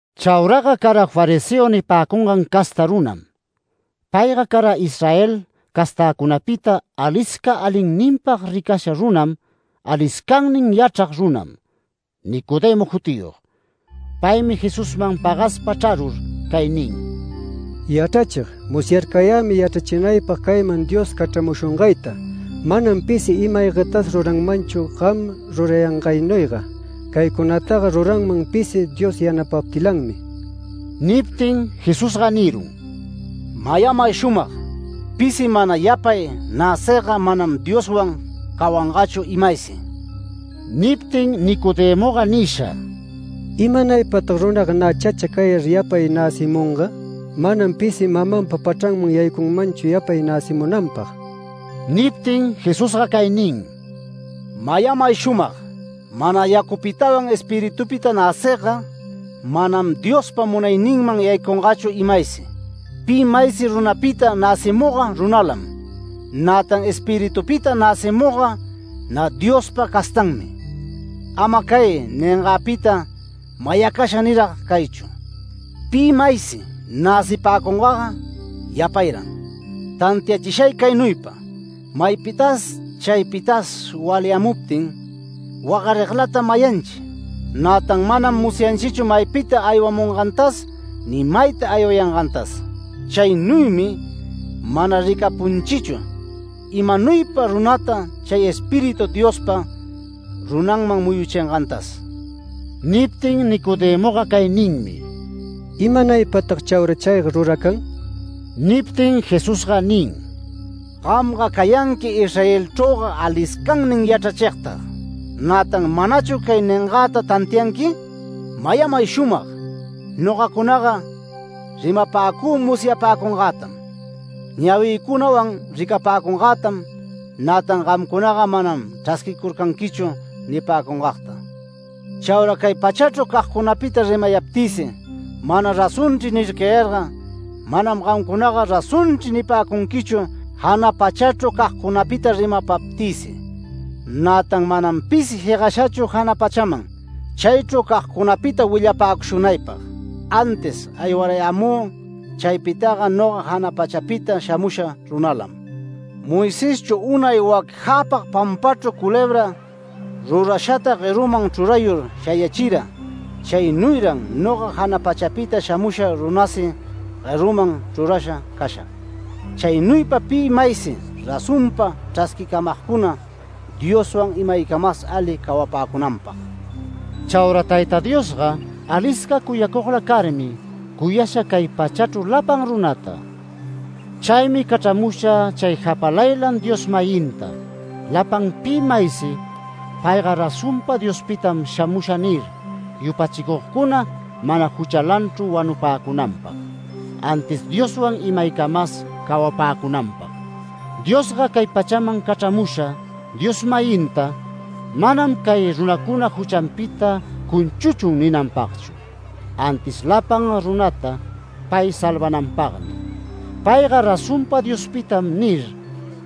Chauraga cara fariseo nipäcungan casta runam. Payga cara Israel castäcunapita, alisca alinninpag ricasha runam aliscannin yachrag runam, Nicodemo jutiyog. Paymi Jesusman pagaspa chrarur cay nin: “Yachrachig, musyarcayämi yachrachinaypag cayman Dios cachramushungayta, manam pisi ima-aygatas ruranmanchu gam rurayangaynuyga. Caycunataga ruranman pisi Dios yanapaptilanmi”. Niptin Jesusga nirun: “Mayamay shumag: Pisi mana yapay näcigga manam Dioswan cawangachu imaysi”. Niptin Nicodemoga nisha: “¿Imanaypatag runaga nä chacha cayar yapay näcimunga? Manam pisi mamanpa pachranman yaycunmanchu yapay näcimunanpag”. Niptin Jesusga cay nin: “Mayamay shumag: Mana yacupitawan Espiritupita näcigga, manam Diospa munayninman yaycungachu imaysi. Pi maysi runapita näcimugga runalam. Nätan Espiritupita näcimugga nä Diospa castanmi. Ama cay ningagpita mayacasha nirag caychu. Pi maysi näcipäcungaga yapayran. Tantiachishay caynuypa: Maypitas chaypitas walyamuptin, wagariglatam mayanchi. Nätan manam musyayanchichu maypita aywamungantas ni mayta aywayangantas. Chaynuymi mana ricapunchichu imanuypa runata chay Espíritu Diospa runanman muyuchingantas”. Niptin Nicodemoga cay ninmi: “¿Imanaypatag chaura chayga ruracan?” Niptin Jesusga nin: “Gamga cayanqui Israelchrüga aliscannin yachrachigtag. Nätan ¿manachu cay ningagta tantianqui? Mayamay shumag: Nogacunaga rimapäcü musyapäcungätam, ñawicunawan ricapäcungätam, nätan gamcunaga manam chrasquicurcanquichu nipäcungagta. Chaura cay pachachru cagcunapita rimayaptïsi, ‘Mana razonchri’ nircayarga manam gamcunaga razonchri nipäcunquichu jana pachachru cagcunapita rimapaptïsi. Nätan manam pisi jegashachu jana pachaman, chaychru cagcunapita willapäcushunaypag, antis aywarayämü chaypitaga, noga jana pachapita shamusha runalam. Moiseschu unay wac jäpag pampachru culebra rurashata gueruman chrurayur shayachira, chaynuyran noga jana pachapita shamusha runasi gueruman chrurasha cashag. Chaynuypa pi maysi razonpa chrasquimagcuna, Dioswan imaycamas ali cawapäcunanpag”. Chaura Tayta Diosga alisca cuyacugla carmi, cuyasha cay pachachru lapan runata. Chaymi cachramusha chay japalaylan Dios-mayinta lapan pi maysi “Payga razonpa Diospitam shamusha” nir, yupachicugcuna mana juchalanchru wanupäcunanpag, antis Dioswan imaycamas cawapäcunanpag. Diosga cay pachaman cachramusha Dios-mayinta manam “Cay runacuna juchanpita cunchuchun” ninanpagchu, antis lapan runata pay salvananpagmi. “Payga razonpa Diospitam” nir,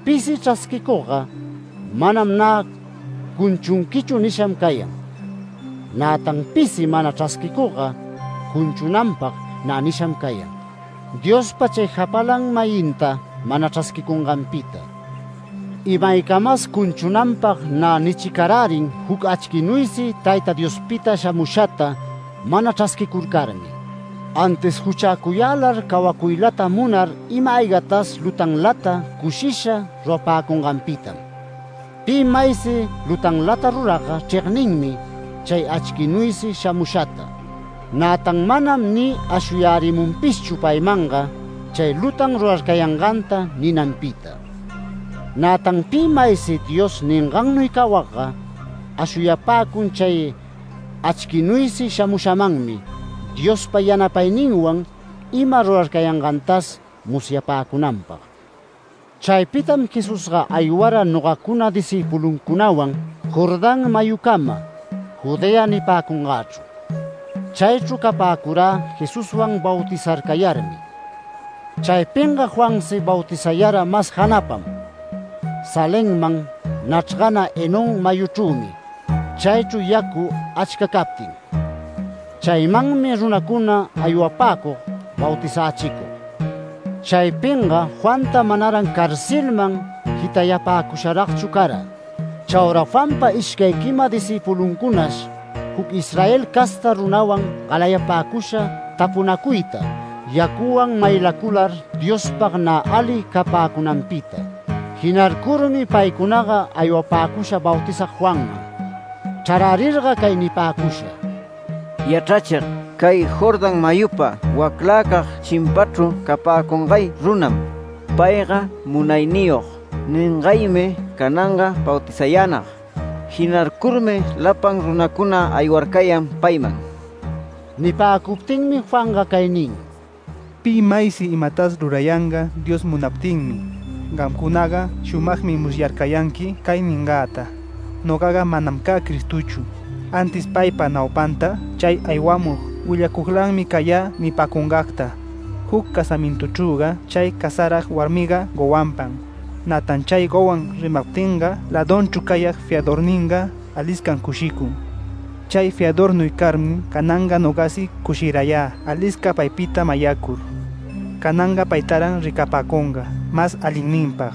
pisi chrasquicugga, “Manam nä cunchunquichu” nisham cayan. Nätan pisi mana chrasquicugga cunchunanpag nä nisham cayan, Diospa chay japalan-mayinta, mana chrasquicunganpita. Imaycamas cunchunanpag nä nichicarärin juc achquinuysi Tayta Diospita shamushata mana chrasquicurcarmi. Antis juchäcuyälar cawacuylata munar ima-aygatas lutanlata cushisha rurapäcunganpitam. Pi maysi lutanlata ruragga chregninmi chay achquinuysi shamushata. Nätan manam ni ashuyärimunpishchu paymanga chay lutan rurarcayanganta ninanpita. Nätan pi maysi Dios ningannuy cawagga ashuyapäcun chay achquinuysi shamushamanmi Diospa yanapayninwan ima rurarcayangantas musyapäcunanpag. Chaypitam Jesusga aywara nogacuna discïpuluncunawan Jordán mayucama Judea nipäcungächru. Chaychru capäcurä Jesuswan bautizarcayarmi. Chaypinga Juansi bautizayara mas janapam, Salemman nachrgana Enón mayuchrümi chaychru yacu achca captin. Chaymanmi runacuna aywapäcug bautizächicug. Chaypinga Juanta manaran carcelman jitayapäcusharagchu cara. Chaura Juanpa ishcay quima discïpuluncunash, juc Israel casta runawan galayapäcusha tapunacuyta yacuwan maylacular Diospag nä ali capäcunanpita. Jinarcurmi paycunaga aywapäcusha Bautizag Juanman. Chrarärirga cay nipäcusha: “Yachrachig, cay Jordán mayupa waclacag chimpachru capäcungay runam. ‘Payga munayniyog’ ningaymi cananga bautizayänag. Jinarcurmi lapan runacuna aywarcayan payman”. Nipäcuptinmi Juanga cay nin: “Pi maysi imatas rurayanga Dios munaptinmi. Gamcunaga shumagmi musyarcayanqui cay ningäta: ‘Nogaga manam cä Cristochu, antis paypa naupanta chay aywamug willacuglanmi cayä’ nipäcungagta. Juc casamintuchrüga chay casarag warmiga gowanpam. Nätan chay gowan rimaptinga lädunchru cayag fiadorninga aliscam cushicun. Chay fiadornuy carmi cananga nogasi cushirayä alisca paypita mayacur. Cananga paytaran ricapäcunga mas alinninpag,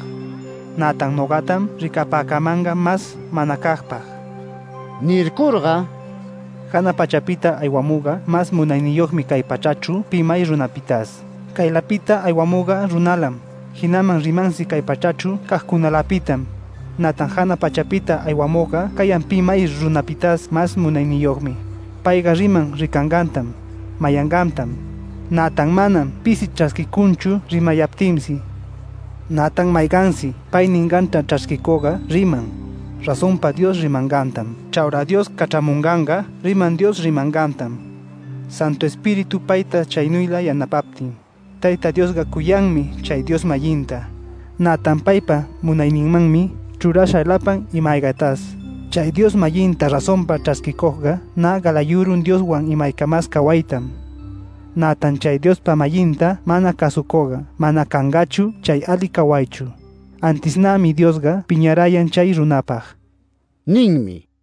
nätan nogatam ricapäcamanga mas manacagpag”. Nircurga “Jana pachapita aywamugga mas munayniyogmi cay pachachru pi may runapitas. Caylapita aywamugga runalam, jinaman rimansi cay pachachru cagcunalapitam, nätan jana pachapita aywamugga cayan pi may runapitas mas munayniyogmi. Payga riman ricangantam, mayangantam, nätan manam pisi chrasquicunchu rimapayaptinsi. Nätan maygansi pay ninganta chrasquicugga riman, razonpa Dios rimangantam. Chaura Dios cachramunganga riman Dios rimangantam, Santu Espíritu payta chaynuyla yanapaptin. Tayta Diosga cuyanmi chay Dios-mayinta, nätan paypa munayninmanmi chrurasha lapan ima-aygatas. Chay Dios-mayinta razonpa chrasquicugga nä galayurun Dioswan imaycamas cawaytam. Nätan chay Diospa-mayinta mana cäsucugga manam cangachu chay ali cawaychru, antis nämi Diosga piñarayan chay runapag” ninmi.